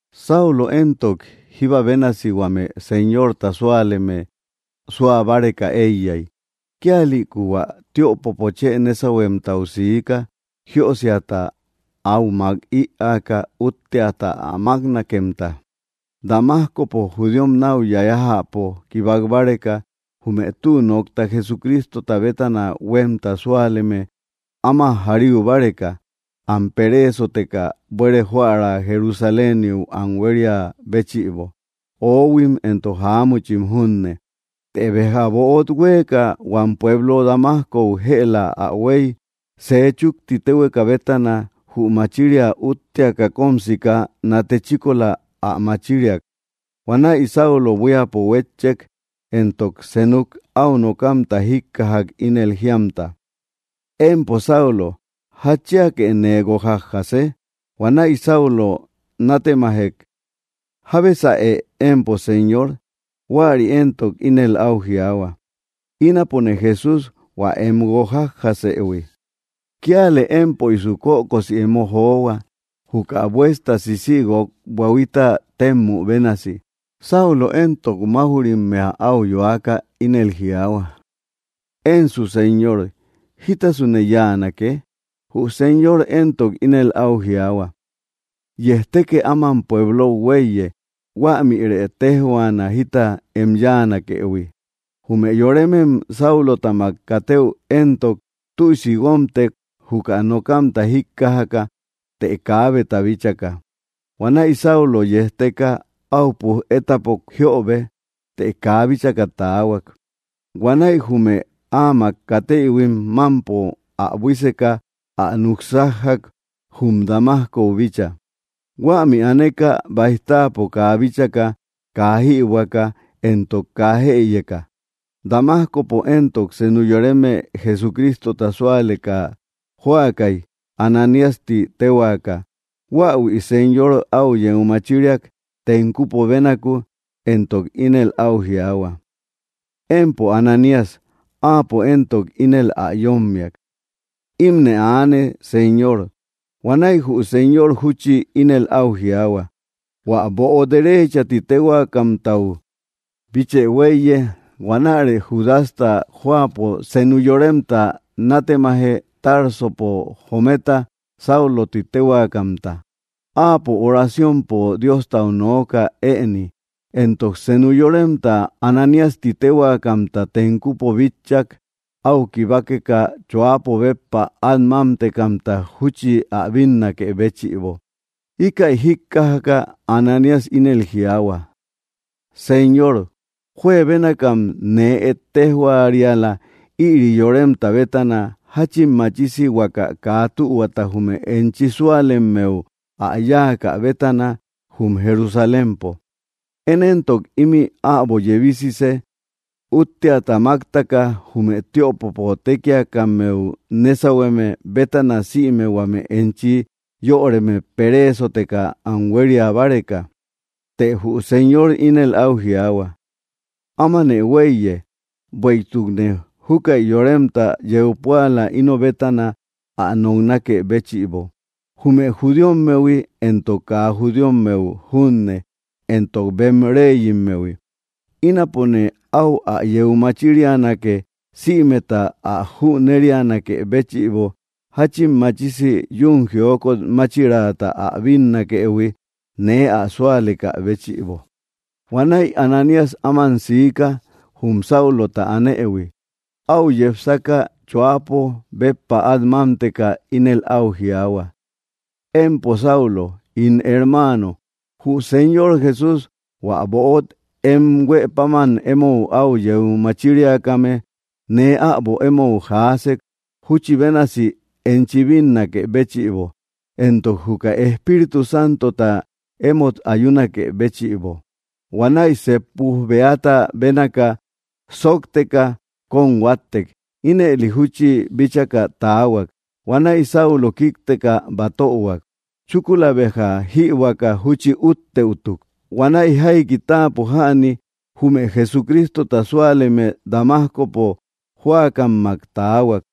Saulo éntok, jíba bénasi huame Señorta súaleme suabáreka eiyai. Kíalïku hua tiöpopo chë nésauhuemtau siika, jiösiata áu mak iäka útteata ä máknakemta Damascopo judíom nau yayajäpo kibákbáreka jume tü nokta Jesucrístota bétana huemta súaleme áma járiubáreka, am pereesoteka buere joära Jerusaléniu am huéria béchïbo, oóhuim, éntok jáamuchim junne. Të béja böot huéeka, huam pueblo Damascou jëla ä huéi, sej chukti téhueka bétana jü machiria útteaka kom sika, nate chíkola ä machíriak. Huanäi Saulo buíapo huétchek, éntok senuk au nokamta jíkkajak ínel jíamta: —Empo Saulo, ¿jatchíake nee guokjájase? Huanäi Saulo nátemajek: —¿Jábesaë empo, Señor? Huäri éntok, ínel au jiaahua: —Ínapone Jesús, hua em guokjájasëhui. Kíalë émpöisu kökosi emo johua, juka buesta sísïguok buahuita témmü bénasi. Saulo éntok, mauj‑rimmea au yoaka ínel jiaahua: —Énsu Señor, ¿jítasune yáanake? Jü Señor éntok, ínel au jiaahua: —Yejtékë áman pueblou huéiye. Huämïrë téjhuaana jita em yáanakëhui. Jume yorémem Sáulotamak katëu éntok, tüisi guómtek juka nokamta jíkkajaka të kaábeta bíchaka. Huanäi Saulo yejteka au puj étapok jiöbe, të kaa bíchaka taahuak. Huanäi jume áamak katéïhuim mampo ä buíseka ä nuksájjak jum Damascou bícha. Huämi aaneka baij táapo kaa bíchaka, kaa jïbuäka, éntok kaa jëyeka. Damascopo éntok, senu yoreme Jesucrístota súaleka jóakai Ananías ti téhuakä, huáahuï Señor au yeu machíriak tenkupo bénaku, éntok ínel au jiaahua: —¡Empo Ananías! Áapo entok ínel ä yommiak: —Imne aane, Señor. Huanäi jü Señor júchi ínel au jiaahua: —Huä böo Derecha ti téhuaakamtau bíchë huéiye. Huanärë Judasta jóapo senu yoremta nátemaje Társopo jometa, Sáulo ti téhuakämta. Áapo oraciompo Diostau nooka éëni, éntok senu yoremta Ananías ti téhuakämta, tenkupo bitchak au kibákeka choápo béppa at mámtekamta júchi ä bínnakë béchïbo. Íkäi jíkkajaka Ananías ínel jiaahua: —Señor, juebénakam nee ettéjhuariala ïri yoremta bétana, jáchin machisi huaka kaa tühuata jume enchi súalemmeu ä yáakä bétana jum Jerusalémpo. Én éntok imï äbo yebísise útteata máktaka jume tiöpopo tékiakammeu nésauhueme bétana sïme huame enchi yöreme peréesoteka am huéria báreka. Të jü Señor ínel au jiaahua: —Ámanë huéiye, bueïtukne júkäi yoremta yeu púala ino bétana ä noknakë béchïbo, jume judíommehui, éntok kaa judíommeu junne, éntok bem réyimmehui. Ínapone au ä yéu machírianake sïmeta ä jünérianakë béchïbo jáchin machisi yuun jiókot máchiraata ä bínnakëhui nee ä súalekä béchïbo. Huanäi Ananías áman siika jum Sáulota anëhui. Au yepsaka, choápo béppa at mámteka, ínel au jiaahua: —Empo Saulo ín hermáano, jü Señor Jesús, hua böot em huë páman emou au yeu machíriakame, nee äbo emou jaásek júchi bénasi enchi bínnakë béchïbo, éntok juka Espíritu Santota émot ayúnakë béchïbo. Huanäi seep puj beata bénaka sóokteka kom huáttek, ínëli júchi bíchaka taahuak. Huanäi Saulo kíkteka batöhuak. Chúkula béja jïbuäka júchi úttëutuk. Huanäi jaiki táapo jäni jume Jesucrístota súaleme Damascopo jóakammak taahuak.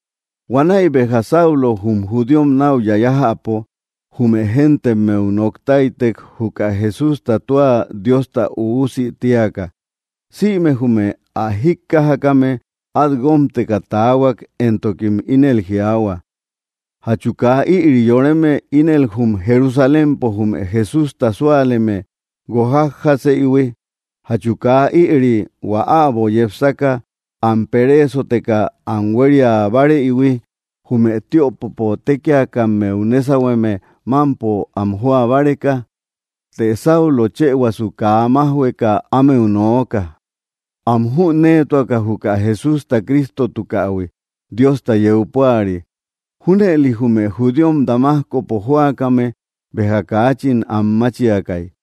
Huanäi béja Saulo jum judíom nau yayajäpo jume géntemmeu noktáitek juka Jesústa tua Diosta Üusi tíaka. Sïme jume ä jíkkajakame at guómteka tahuak, éntokim ínel jiaahua: —¿Jatchu kaa ïri yoreme ínel jum Jerusalémpo jume Jesústa súaleme guokjájaseïhui? ¿Jatchu kaa ïri hua äbo yepsaka am peréesoteka am huéria báareïhui jume tiöpopo tékiakammeu nésauhueme mampo am joa báreka? Të Saulo chëhuasu kaa májhueka ámeu nooka, am jünéetuaka juka Jesústa Crístotukähui Diosta yeu púari. Júnëli jume judíom Damascopo jóakame béja kaachin anmáchiakai.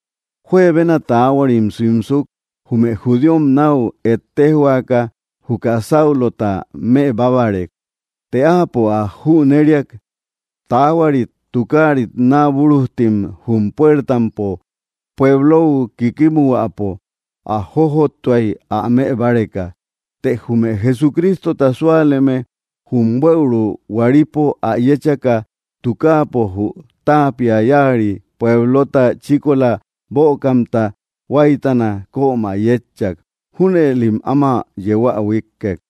Juebena taáhuarim simsuk, jume judíom nau ettéjhuakä juka Sáulota mëbábarek, të áapo ä jüneriak. Taáhuarit tukáarit naabúrujtim jum puértampo pueblou kíkimuhuäpo ä jójottuai ä mëbáreka. Të jume Jesucrístota súaleme jum buëuru huäripo ä yéchaka, tukáapo jü taapia yari puéblota chíkola bökamta huáitana kömä yétchak. Júnëlim áma yeu ä huikkek.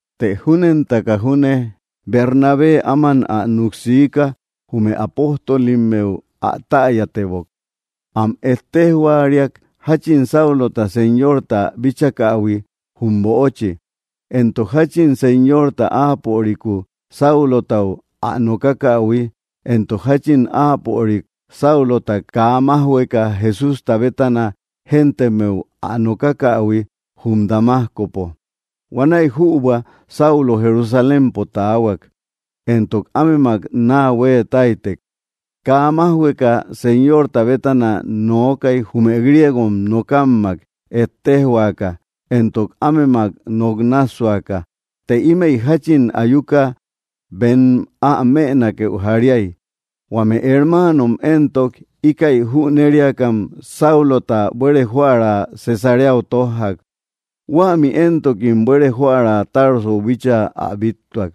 Të júnentaka júne Bernabé áman ä nuk sika jume apóstolimmeu ä täyatebok, am ettéjhuariak jachin Saulota Señorta bíchakähui jum böochi, éntok jachin Señorta áapöriku, Sáulotau, ä nokákähui, éntok jachin áapörik, Sáulota, kaa májhueka Jesústa bétana géntemmeu ä nokákähui jum Damascopo. Huanäi jübua Saulo Jerusalémpo taahuak, éntok ámemak naa hueetáitek. Kaa májhueka Señorta bétana nookai jume griego nókammak ettéjhuakä, éntok ámemak nok nássuaka. Të ímëi jachin ayuka bem ä mënakeu jaríai. Huame hermáanom éntok, íkäi jüneriakam Sáulota buere joära Cesareau tójjak, huämi éntokim buere joära Tarsou bíchaa ä bíttuak.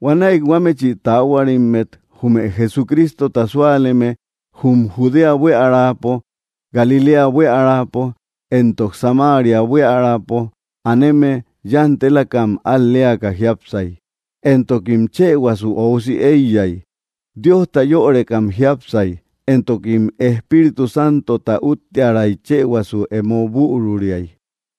Huanäi huámechi taáhuarimmet jume Jesucrístota súaleme jum Judea buíaräpo, Galiléa buíaräpo, éntok Samaria buíaräpo aneme yantelakam al‑leaka jiápsay, éntokim chëhuasu óusi eiyay. Diosta yörekam jiápsay, éntokim Espíritu Santota úttiäray chëhuasu emo büruriay.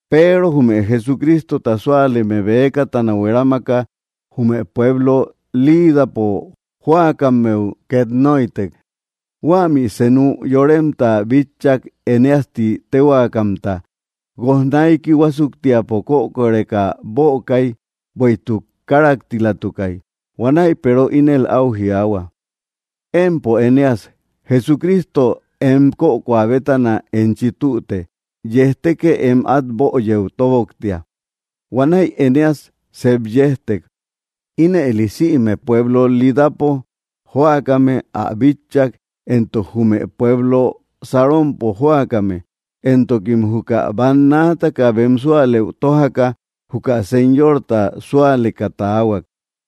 Peero jume Jesucrístota súaleme bëkatana huerámaka jume pueblo Lídapo jóakammeu ket nóitek. Huämi senu yoremta bitchak Enéas ti téhuakamta, guojnaiki huásuktiapo kökoreka bökai, bueïtuk káraktilatukai. Huanäi Peero ínel au jiaahua: —Empo Eneas, Jesucristo em kökoa bétana enchi tüte. Yejtekë em at böyëu tóboktia. Huanäi Eneas sep yéjtek. Ínëli sïme pueblo Lídapo jóakame ä bitchak, éntok jume pueblo Saronpo jóakame, éntokim juka bannaataka bem súalëu tójaka juka Señorta súaleka taahuak.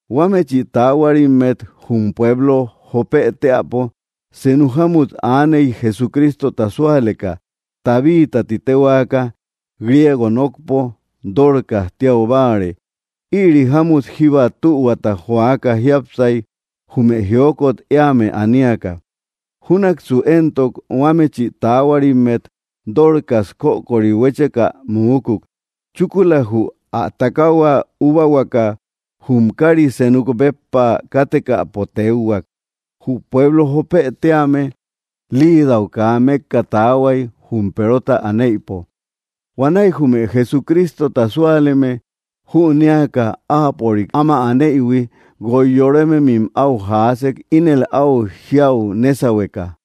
Huámechi taáhuarimmet jum pueblo Jópë teäpo senu jámmut aaney Jesucrístota súaleka Tabítä ti téhuaka, griego nokpo Dórcas tíau báare. Ïri jámmut jíba tühuata joaka jiápsai jume jiókot éame aníaka. Júnaksu éntok huámechi taáhuarimmet Dorcas kökori huécheka muúkuk. Chúkula jü ä takahua úbahuaka jum kari senuk béppa kátekäpo tékhuak. Jü pueblo Jópë tíame Lidau kaa mekka taahuai jum Perota anéïpo. Huanäi jume Jesucrístota súaleme jünéaka áapörik áma anëihui, guoi yorémemim au jaásek ínel au jiáu nésauhueka: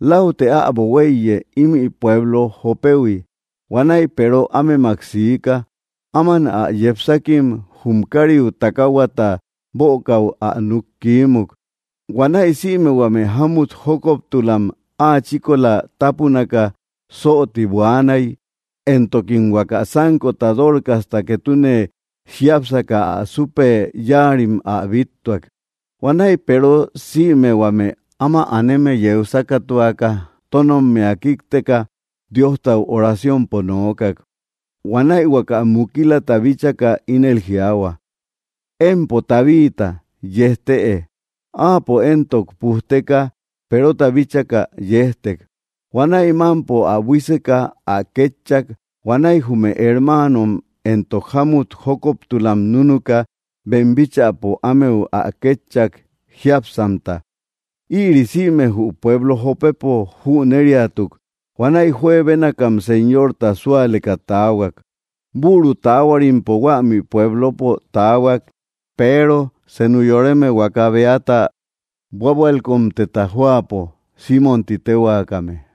—Láutë äbo huéiye ímï pueblo Jópehui. Huanäi Peero ámemak siika. Áman ä yepsákim jum kariu takáhuata bökäu ä nuk kiímuk. Huanäi sïme huame jámut jókoptulam áa chíkola tápunaka sóoti buaanai, éntokim huaka sánkota Dorcasta ketune jiápsaka ä supe yáarim ä bíttuak. Huanäi Peero sïme huame áma aneme yeu sákatuaka, tónommia kíkteka Diostau oraciompo nookak. Huanäi huaka mukilata bíchaka ínel jiaahua: —Empo Tabita, yejtëe. Áapo éntok pujteka, Perota bíchaka, yéjtek. Huanäi mampo ä buíseka ä kétchak. Huanäi jume hermáanom éntok jámut jókoptulam núnuka bem bíchäpo ámeu ä kétchak jiápsamta. Ïri sïme jü pueblo Jópepo jüneriatuk. Huanäi juebénakam Señorta súaleka taahuak. Büru taahuarimpo huämi pueblopo taahuak, Peero, senu yoreme huaka beata búabualkotemta jóapo, Simmom ti téhuakame.